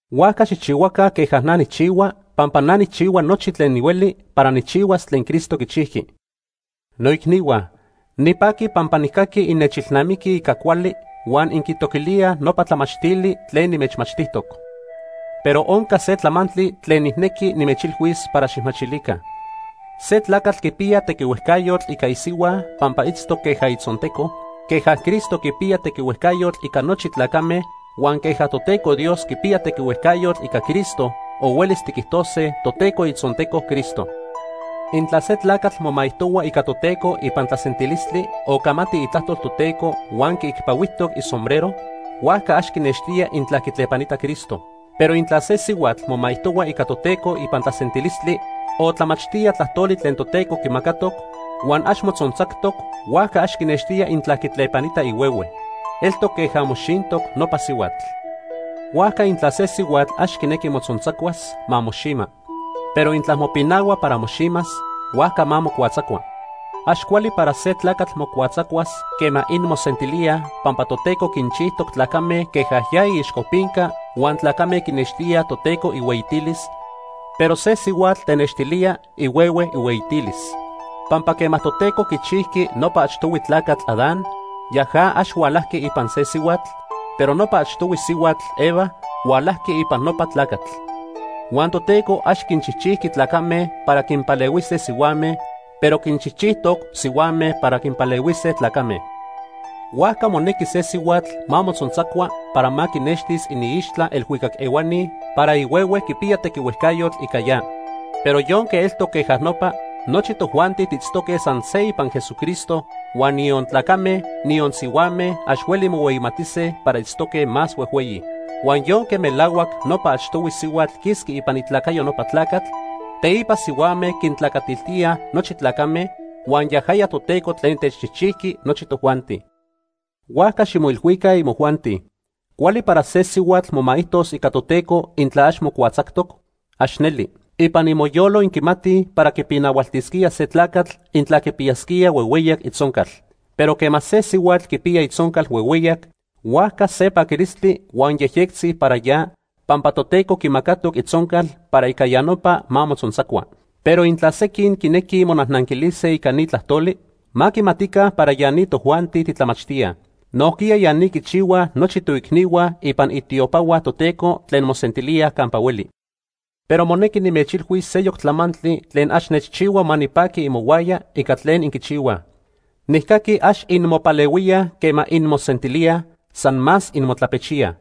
Huajca xijchihuaca queja na nijchihua pampa na nijchihua nochi tlen nihueli para nijchihuas tlen Cristo quichijqui. Noicnihua, nipaqui pampa nijcaqui innechilnamiquij ica cuali huan inquitoquilíaj nopa tlamachtili tlen nimechmachtijtoc. Pero onca se tlamantli tlen nijnequi nimechilhuis para xijmachilica. Se tlacatl quipiya tequihuejcayotl ica isihua pampa itztoc queja itzonteco, queja Cristo quipiya tequihuejcayotl ica nochi tlacame, huan queja Toteco Dios quipiya tequihuejcayotl ica Cristo o huelis tiquijtose Toteco itzonteco Cristo. Intla se tlacatl momaijtohua ica Toteco ipan tlasentilistli o camati itlajtol Toteco huan quiicpahuijtoc isombrero, huajca ax quinextía intla quitlepanita Cristo. Pero intla se sihuatl momaijtohua ica Toteco ipan tlasentilistli o tlamachtía tlajtoli tlen Toteco quimacatoc huan ax motzontzactoc, huajca ax quinextía intla quitlepanita ihuehue. Eltoc queja moxintoc nopa sihuatl. Huajca intla se sihuatl ax quinequi mocuatzacuas, ma moxima. Pero intla mopinahua para moximas, huajca ma mocuatzacua. Ax cuali para se tlacatl mocuatzacuas quema inmosentilíaj, pampa Toteco quinchijtoc tlacame queja ya iixcopinca huan tlacame quinextíaj Toteco ihueyitilis, pero se sihuatl tenextilía ihuehue ihueyitilis. Pampa quema Toteco quichijqui nopa achtohui tlacatl, Adán, yaja ax hualajqui ipan se sihuatl, pero nopa achtohui sihuatl, Eva, hualajqui ipan nopa tlacatl. Huan Toteco ax quinchijchijqui tlacame para quinpalehuise sihuame, pero quinchijchijtoc sihuame para quinpalehuise tlacame. Huajca monequi se sihuatl ma motzontzacua para ma quinextis iniixtla elhuicac ehuani para ihuehue quipiya tequihuejcayotl ica ya. Pero yonque eltoc queja nopa, nochi tojuanti tiitztoque san se ipan Jesucristo, huan niyon tlacame, niyon sihuame ax hueli mohueyimatise para itztoque más huejhueyi. Huan yonque melahuac nopa achtohui sihuatl quisqui ipan itlacayo nopa tlacatl, teipa sihuame quintlacatiltíaj nochi tlacame, huan yajaya Toteco tlen techchijchijqui nochi tojuanti. Huajca ximoilhuica, imojuanti. ¿Cuali para se sihuatl momaijtos ica Toteco, intla ax mocuatzactoc? ¡Ax neli! Ipan imoyolo inquimatij para quipinahualtisquía se tlacatl intla quipiyasquía huehueyac itzoncal, pero quema se sihuatl quipiya itzoncal huehueyac, huajca se paquilistli huan yejyectzi para ya pampa Toteco quimacatoc itzoncal para ica ya nopa ma motzontzacua. Pero intla sequin quinequij monajnanquilise ica ni tlajtoli, ma quimatica para ya ni tojuanti titlamachtíaj. Nojquiya ya ni quichihuaj nochi toicnihua ipan itiopahua Toteco tlen mosentilíaj campa hueli. Pero monequi nimechilhuis seyoc tlamantli tlen ax nechchihua ma nipaqui imohuaya ica tlen inquichihuaj. Nijcaqui ax inmopalehuíaj quema inmosentilíaj, san más inmotlapechíaj.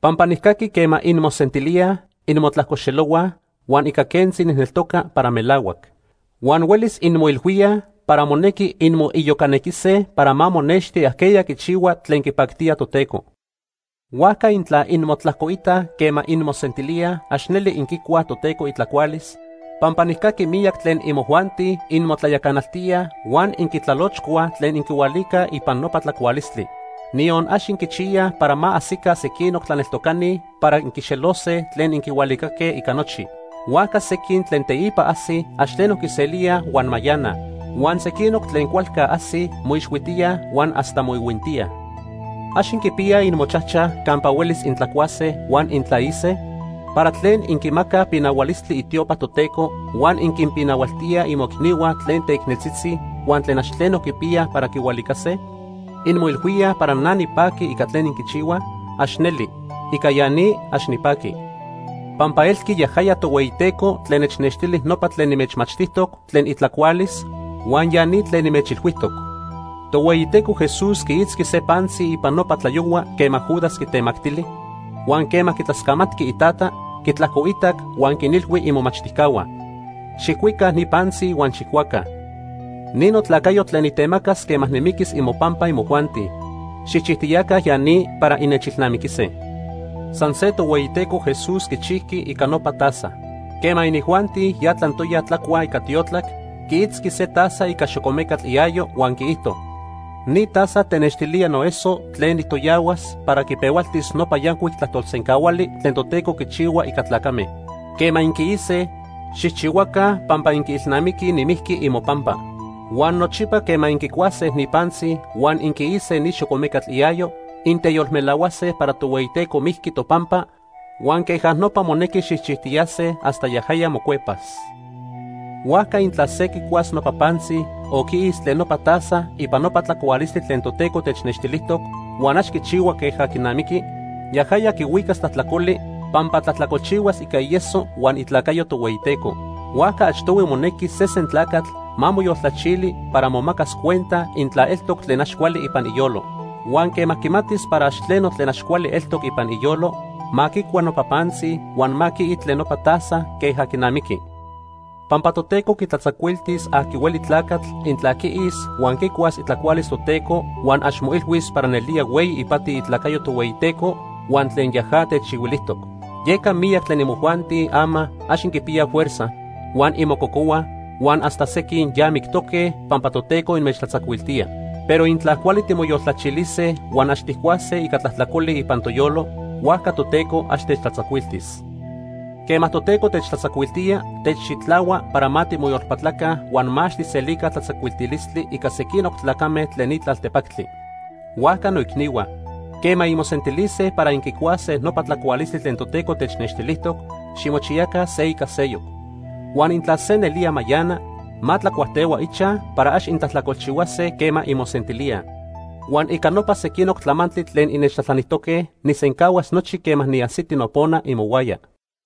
Pampa nijcaqui quema inmosentilíaj, inmotlajcoxelohuaj, huan ica quentzi nijneltoca para melahuac. Huan huelis inmoilhuíaj para monequi inmoiyocanequise para ma monexti ajqueya quichihua tlen quipactía Toteco. Huajca intla inmotlajcoitaj quema inmosentilíaj, ax neli inquicuaj Toteco itlacualis, pampa nijcaqui miyac tlen imojuanti inmotlayacanaltíaj huan inquitlalochcuaj tlen inquihualicaj ipan nopa tlacualistli. Niyon ax inquichiyaj para ma ajsica sequinoc tlaneltocani para inquixelose tlen inquihualicaque ica nochi. Huajca sequin tlen teipa ajsij ax tleno quiselíaj huan mayanaj. Huan sequinoc tlen cualca ajsij moixhuitíaj huan hasta moihuintíaj. ¿Ax inquipiyaj imochajchaj campa huelis intlacuase huan intlaise? ¿Para tlen inquimacaj pinahualistli itiopa Toteco huan inquinpinahualtíaj imoicnihua tlen teicneltzitzi huan tlen ax tleno quipiyaj para quihualicase? ¿Inmoilhuíaj para na nipaqui ica tlen inquichihuaj? ¡Ax neli! ¡Ica ya ni, ax nipaqui! Pampa elqui yajaya Tohueyiteco tlen nechnextili nopa tlen nimechmachtijtoc tlen itlacualis, huan ya ni tlen nimechilhuijtoc. Tohueyiteco Jesús quiitzqui se pantzi ipan nopa tlayohua quema Judas quitemactili, huan quema quitlascamatqui iTata, quitlajcoitac, huan quinilhui imomachtijcahua: “Xijcuica ni pantzi huan xijcuaca. Ni notlacayo tlen nitemacas quema nimiquis imopampa imojuanti. Xijchijtiyaca ya ni para innechilnamiquise.” San se Tohueyiteco Jesús quichijqui ica nopa taza. Quema inijuanti ya tlantoya tlacuaj ica tiotlac, quiitzqui se taza ica xocomecatl iayo huan quiijto: “Ni taza tenextilía noeso tlen nijtoyahuas para quipehualtis nopa yancuic tlajtolsencahuali tlen Toteco quichihua ica tlacame. Quema inquiise, xijchihuaca pampa inquiilnamiquij nimijqui imopampa.” Huan nochipa quema inquicuase ni pantzi huan inquiise ni xocomecatl iayo, inteyolmelahuase para Tohueyiteco mijqui topampa huan queja nopa monequi xijchijtiyase hasta yajaya mocuepas. Huajca intla se quicuas nopa pantzi o quiis tlen nopa taza ipan nopa tlacualistli tlen Toteco technextilijtoc, huan ax quichihua queja quinamiqui, yajaya quihuicas tlajtlacoli pampa tlajtlacolchihuas ica ieso huan itlacayo Tohueyiteco. Huajca achtohui monequi sesen tlacatl ma moyoltlachili para momacas cuenta intla eltoc tlen ax cuali ipan iyolo. Huan quema quimatis para ax tleno tlen ax cuali eltoc ipan iyolo, ma quicua nopa pantzi huan ma quii tlen nopa taza queja quinamiqui. Pampa Toteco quitlatzacuiltis aqui hueli tlacatl intla quiis huan quicuas itlacualis Toteco huan ax moilhuis para nelía hueyi ipati itlacayo Tohueyiteco huan tlen yaja techchihuilijtoc. Yeca miyac tlen imojuanti ama ax inquipiyaj fuerza, huan inmococohuaj, huan hasta sequin ya mictoque pampa Toteco inmechtlatzacuiltía. Pero intla cuali timoyoltlachilise huan ax tijcuase ica tlajtlacoli ipan toyolo, huajca Toteco ax techtlatzacuiltis. Quema Toteco techtlatzacuiltía, techxitlahua para ma timoyolpatlaca huan ma ax tijselica tlatzacuiltilistli ica sequinoc tlacame tlen ni tlaltepactli. Huajca noicnihua, quema inmosentilise para inquicuase nopa tlacualistli tlen Toteco technextilijtoc, ximochiyaca se ica seyoc. Huan intla se nelía mayana, ma tlacuajtehua ichaj para ax intlajtlacolchihuase quema inmosentilíaj. Huan ica nopa sequinoc tlamantli tlen innechtlajtlanijtoque, nijsencahuas nochi quema niajsiti nopona imohuaya.